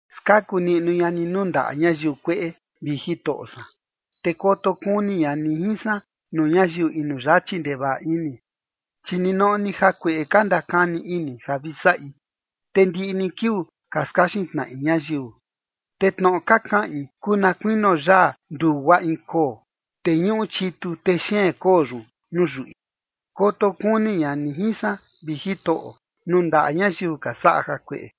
Skaku niꞌnu ña ni nuu ndaꞌa ñayiu kueꞌe, vi Jitoꞌo san, te koto kuni ña ni jin san nuu ñayiu inu yachi ndevaꞌa ini. Chi ninoꞌo ni jakueꞌe ka ndakani ini ja vi saꞌi, te ndiꞌi ni kiuu ka skaxin tnaꞌi ñayiu. Te tnoꞌo ka kaꞌin kuu na kuinio yaa ndugua in koo, te ñuꞌu chitu texeen koo yun nuu yuꞌi. Koto kuni ña ni jin san, vi Jitoꞌo, nuu ndaꞌa ñayiu ka saꞌa jakueꞌe,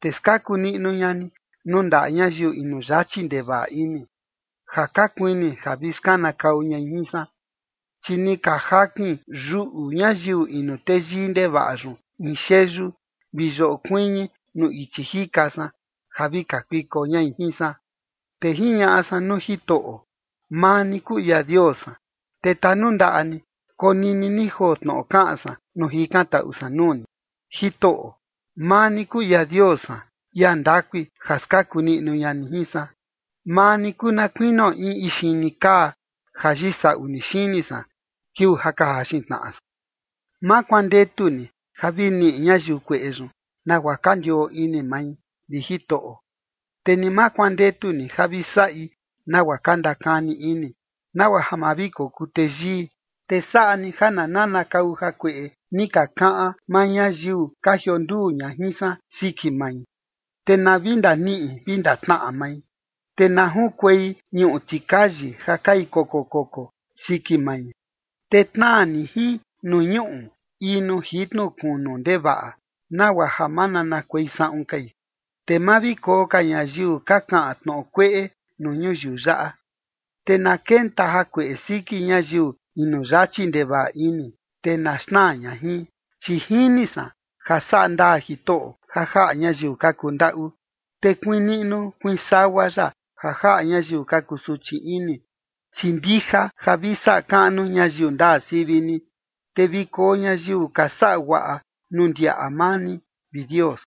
te skaku niꞌnu ña ni nuu ndaꞌa ñayiu inu yachi ndevaꞌa ini, ja ka kuini ja vi skanakau ñai jin san. Chi ni ka jakin yuꞌu ñayiu inu teyii ndevaꞌa yun in xeyu vi yoꞌo kuiñi nuu ichi jika san, ja vi kakuiko ñai jin san. Te jiñaꞌa san nuu Jitoꞌo: “Maa ni kuu ia Dios san, te tanundaꞌa ni, konini ni joo tnoꞌo kaꞌan san nuu jikantaꞌu san nuu ni. Jitoꞌo, maa ni kuu ia Dios san, ia ndakui ja skaku niꞌnu ña ni jin san. Maa ni kuu na kuinio in ixini kaa ja yisaꞌu ni xini san, kiuu ja ka jaxin tnaꞌa san. ’Ma kuandetu ni ja vi niꞌi ñayiu kueꞌe yun nagua ka ndioo ini mai, vi Jitoꞌo, te ni ma kuandetu ni ja vi saꞌi nagua ka ndakani ini, nagua ja ma vi kokuu teyii. Te saꞌa ni ja na nanakau jakueꞌe ni ka kaꞌan maa ñayiu ka jionduu ña jin san siki mai, te na vi ndaniꞌi vi ndatnaꞌa mai, te na junkuei ñuꞌu tikayi ja kai koko koko siki mai. Te tnaa ni jin nuu ñuꞌu, in nuu jitnu kunu ndevaꞌa, nagua ja ma nanakuei saꞌun kai. Te ma vi koo ka ñayiu ka kaꞌan tnoꞌo kueꞌe nuu ñuyiu yaꞌa, te na kenta jakueꞌe siki ñayiu inu yachi ndevaꞌa ini, te na xnaa ña jin. ’Chi jini san ja saꞌa ndaa Jitoꞌo ja jaꞌa ñayiu ka kundaꞌu, te kuiin niꞌnu kuiin sagua ya ja jaꞌa ñayiu ka kusuchi ini. Chi ndija ja vi saꞌa kaꞌnu ñayiu ndaa sivi ni, te vi koo ñayiu ka saꞌa guaꞌa nuu ndiaꞌa maa ni, vi Dios.”